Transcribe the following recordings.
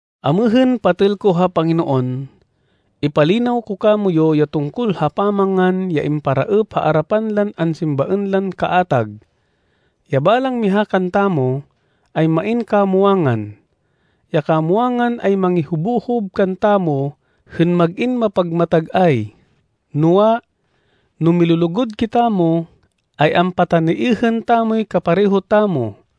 Amêhên, patêl ko ha Panginoon, ipalinaw ko kamoyu ya tungkol ha pamangan ya imparaêp ha arapan lan ansimbaên lan kaatag. Ya balang miha kantamo ay main kamwangan. Ya kamwangan ay mangihobohob kantamo hên mag-in mapagmatag-ay. Noa, no milulugud kitamo, ay ampataniêhên tamoy kapareho tamo.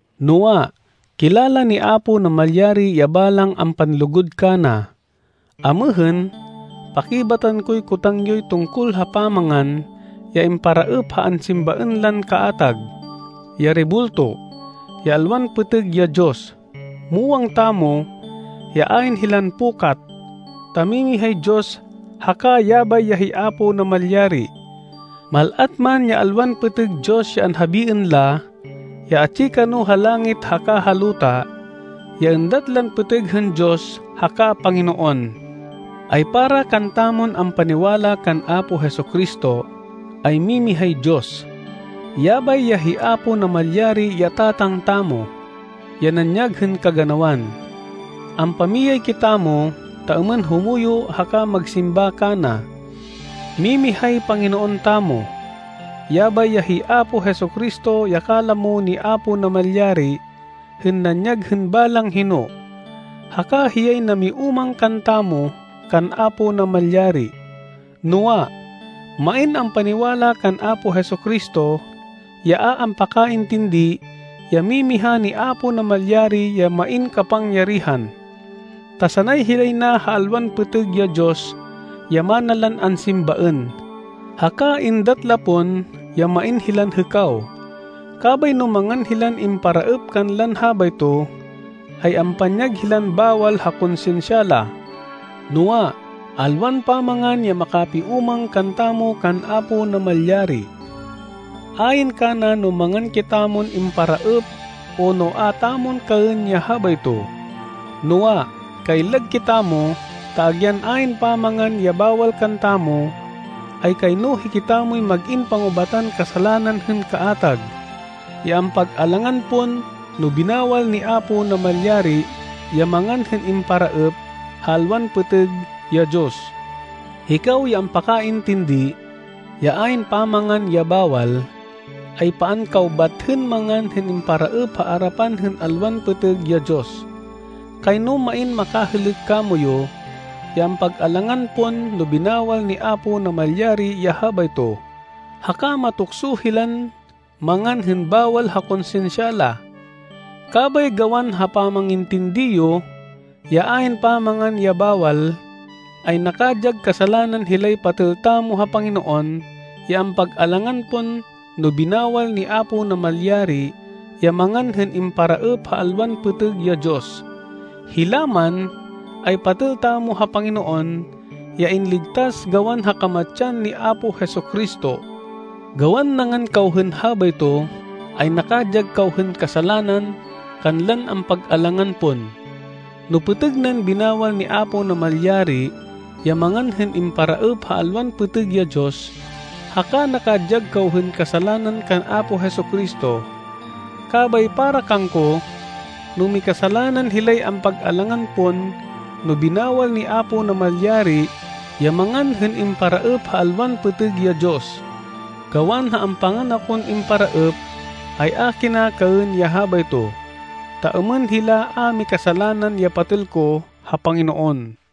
Noa, kilala ni Apo Namalyari ya balang ampanlugud kana. Amêhên, pakibatan koy kotang yoy tungkol ha pamangan ya imparaêp ha ansimbaên lan kaatag, ya rebulto, ya alwan pêtêg ya diyos. Muwang tamo ya ayn hilan pukat, ta mimihay Diyos haka yabay ya hi Apo Namalyari. Mal-at man ya alwan pêtêg diyos ya anhabiên la, ya atsi kano ha langit haka ha luta, ya êndat lan pêtêg hên diyos haka panginoon, ay para kantamon ampaniwala kan Apo Jesu-Cristo, ay mimihay Diyos. Yabay ya hi Apo Namalyari ya Tatang tamo, ya nanyag hên kaganawan. Ampamiyay kitamo ta êmên humuyo haka magsimba kana. Mimihay Panginoon tamo. Yabay ya hi Apo Jesu-Cristo ya kalamo ni Apo Namalyari hên nanyag hên balang hino, haka hiyay namiúmang kantamo kan Apo Namalyari. Noa, main ampaniwala kan Apo Jesu-Cristo, ya a ampakaintindi ya mimiha ni Apo Namalyari ya main kapangyarihan, ta sanay hilay na ha alwan pêtêg ya diyos ya mana lan ansimbaên, haka êndat la pon ya main hilan hêkaw. Kabay no mangan hilan imparaêp kanlan habayto, ay ampanyag hilan bawal ha konsinsya la. Noa, alwan pamangan ya makapiúmang kantamo kan Apo Namalyari. Ayn kana no mangan kitamon imparaêp o no a tamon kaên ya habayto. Noa, kaillag kitamo ta agyan ayn pamangan ya bawal kantamo, ay kayno hikitamoy mag-in pangubatan kasalanan hên kaatag, ya ampag-alangan pon no binawal ni Apo Namalyari ya mangan hên imparaêp ha alwan pêtêg ya diyos. Hikaw ya ampakaintindi ya ayn pamangan ya bawal, ay paan kaw bat hên mangan hên imparaêp ha arapan hên alwan pêtêg ya diyos. Kayno main makahêlêk kamoyu ya ampag-alangan pon no binawal ni Apo Namalyari ya habayto, haka matukso hilan mangan hên bawal ha konsinsya la. Kabay gawan ha pamangintindi yo, ya ayn pamangan ya bawal, ay nakadyag kasalanan hilay patêl tamo ha Panginoon ya ampag-alangan pon no binawal ni Apo Namalyari ya mangan hên imparaêp ha alwan pêtêg ya diyos. Hila man ay patêl tamo ha Panginoon ya inligtas gawan ha kamatsan ni Apo Jesu-Cristo. Gawan nangan kaw hên habayto, ay nakadyag kaw hên kasalanan kanlan ampag-alangan pon, no pêtêg nan binawal ni Apo Namalyari ya mangan hên imparaêp ha alwan pêtêg ya diyos, haka nakadyag kaw hên kasalanan kan Apo Jesu-Cristo. Kabay para kangko, no mikasalanan hilay ampag-alangan pon no binawal ni Apo Namalyari ya mangan hên imparaêp ha alwan pêtêg ya diyos, gawan ha ampangan akon imparaêp, ay a kina kaên ya habayto, ta êmên hila a mikasalanan ya patêl ko ha Panginoon.